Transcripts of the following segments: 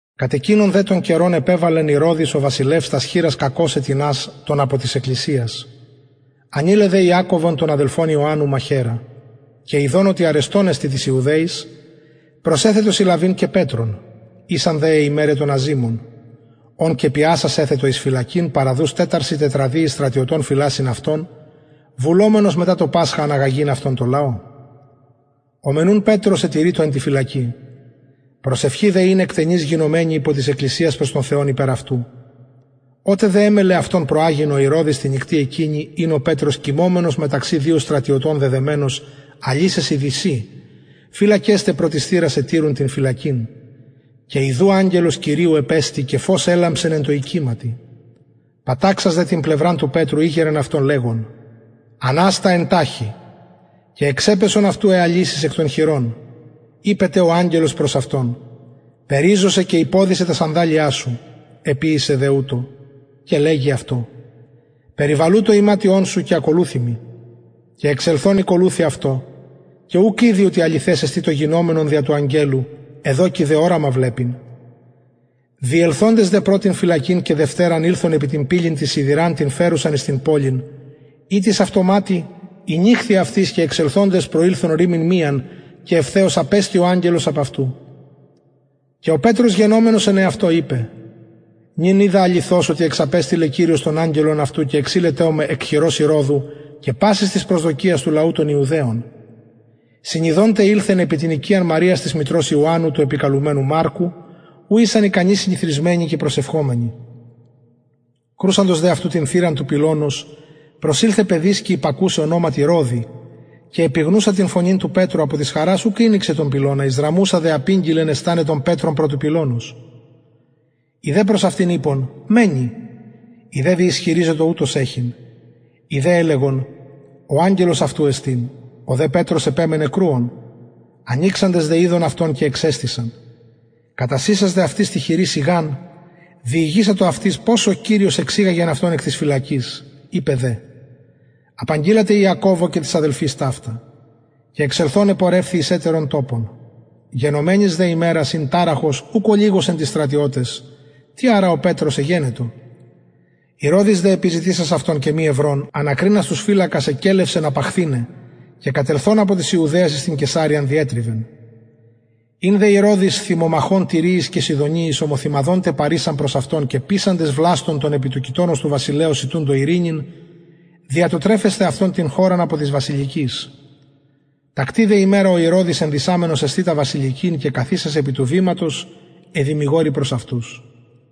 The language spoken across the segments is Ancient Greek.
κατ εκεινον δε τον καιρον επεβαλεν ηρωδης ο βασιλευς τας χειρας κακωσαι τινας των απο της εκκλησιας ανειλεν δε ιακωβον τον αδελφον ιωαννου μαχαιρα και ιδων οτι αρεστον εστιν τοις ιουδαιοις προσεθετο συλλαβειν και πετρον ησαν δε αι ημεραι των αζυμων ον και πιασας εθετο εις φυλακην παραδους τεσσαρσιν τετραδιοις στρατιωτων φυλασσειν αυτον βουλομενος μετα το πασχα αναγαγειν αυτον τω λαω ο μεν ουν πετρος ετηρειτο εν τη φυλακη προσευχη δε ην εκτενης γινομενη υπο της εκκλησιας προς τον θεον υπερ αυτου οτε δε εμελλεν αυτον προαγειν ο ηρωδης τη νυκτι εκεινη ην ο πετρος κοιμωμενος μεταξυ δυο στρατιωτων δεδεμενος αλυσεσιν δυσιν φυλακες τε προ της θυρας ετηρουν την φυλακην και ιδου αγγελος κυριου επεστη και φως ελαμψεν εν τω οικηματι παταξας δε την πλευραν του πετρου ηγειρεν αυτον λεγων αναστα εν ταχει και εξεπεσον αυτου αι αλυσεις εκ των χειρων ειπεν τε ο αγγελος προς αυτον περιζωσαι και υποδησαι τα σανδαλια σου εποιησεν δε ουτως και λεγει αυτω περιβαλου το ιματιον σου και ακολουθει μοι και εξελθων ηκολουθει αυτω και ουκ ηδει οτι αληθες εστιν το γινομενον δια του αγγελου εδοκει δε οραμα βλεπειν διελθοντες δε πρωτην φυλακην και δευτεραν ηλθον επι την πυλην την σιδηραν την φερουσαν εις την πολιν ητις αυτοματη ηνοιχθη αυτοις και εξελθοντες προηλθον ρυμην μιαν και ευθεως απεστη ο αγγελος απ αυτου και ο πετρος γενομενος εν εαυτω ειπεν νυν οιδα αληθως οτι εξαπεστειλεν κυριος τον αγγελον αυτου και εξειλετο με εκ χειρος ηρωδου και πασης της προσδοκιας του λαου των ιουδαιων συνιδων τε ηλθεν επι την οικιαν μαριας της μητρος ιωαννου του επικαλουμενου μαρκου ου ησαν ικανοι συνηθροισμενοι και προσευχομενοι κρουσαντος δε του πετρου την θυραν του πυλωνος προσηλθεν παιδισκη υπακουσαι ονοματι ροδη και επιγνουσα την φωνην του πετρου απο της χαρας ουκ ηνοιξεν τον πυλωνα εισδραμουσα δε απηγγειλεν εσταναι τον πετρον προ του πυλωνος οι δε προς αυτην ειπον μαινη η δε διισχυριζετο ουτως εχειν οι δε ελεγον ο αγγελος αυτου εστιν ο δε πετρος επεμενεν κρουων ανοιξαντες δε ειδον αυτον και εξεστησαν κατασεισας δε αυτοις τη χειρι σιγαν διηγησατο αυτοις πως ο κυριος αυτον εξηγαγεν εκ της φυλακης ειπεν δε απαγγειλατε ιακωβω και τοις αδελφοις ταυτα και εξελθων επορευθη εις ετερον τοπον γενομενης δε ημερας ην ταραχος ουκ ολιγος εν τοις στρατιωταις τι αρα ο πετρος εγενετο ηρωδης δε επιζητησας αυτον και μη ευρων ανακρινας τους φυλακας εκελευσεν απαχθηναι και κατελθων απο της ιουδαιας εις την καισαρειαν διετριβεν ην δε ο ηρωδης θυμομαχων τυριοις και σιδωνιοις ομοθυμαδον δε παρησαν προς αυτον και πεισαντες βλαστον τον επι του κοιτωνος του βασιλεως ητουντο ειρηνην δια το τρεφεσθαι αυτων την χωραν απο της βασιλικης τακτη δε ημερα ο ηρωδης ενδυσαμενος εσθητα βασιλικην και καθισας επι του βηματος εδημηγορει προς αυτους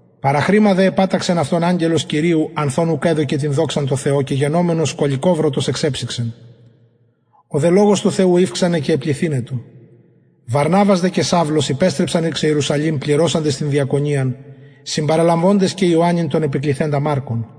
παραχρημα δε επαταξεν αυτον αγγελος κυριου ανθ ων ουκ εδωκεν δοξαν τω θεω και γενομενος σκωληκοβρωτος εξεψυξεν ο δε λογος του θεου ηυξανεν και επληθυνετο βαρναβας δε και σαυλος υπεστρεψαν εις ιερουσαλημ πληρωσαντες την διακονιαν συμπαραλαβοντες και ιωαννην τον επικληθεντα μαρκον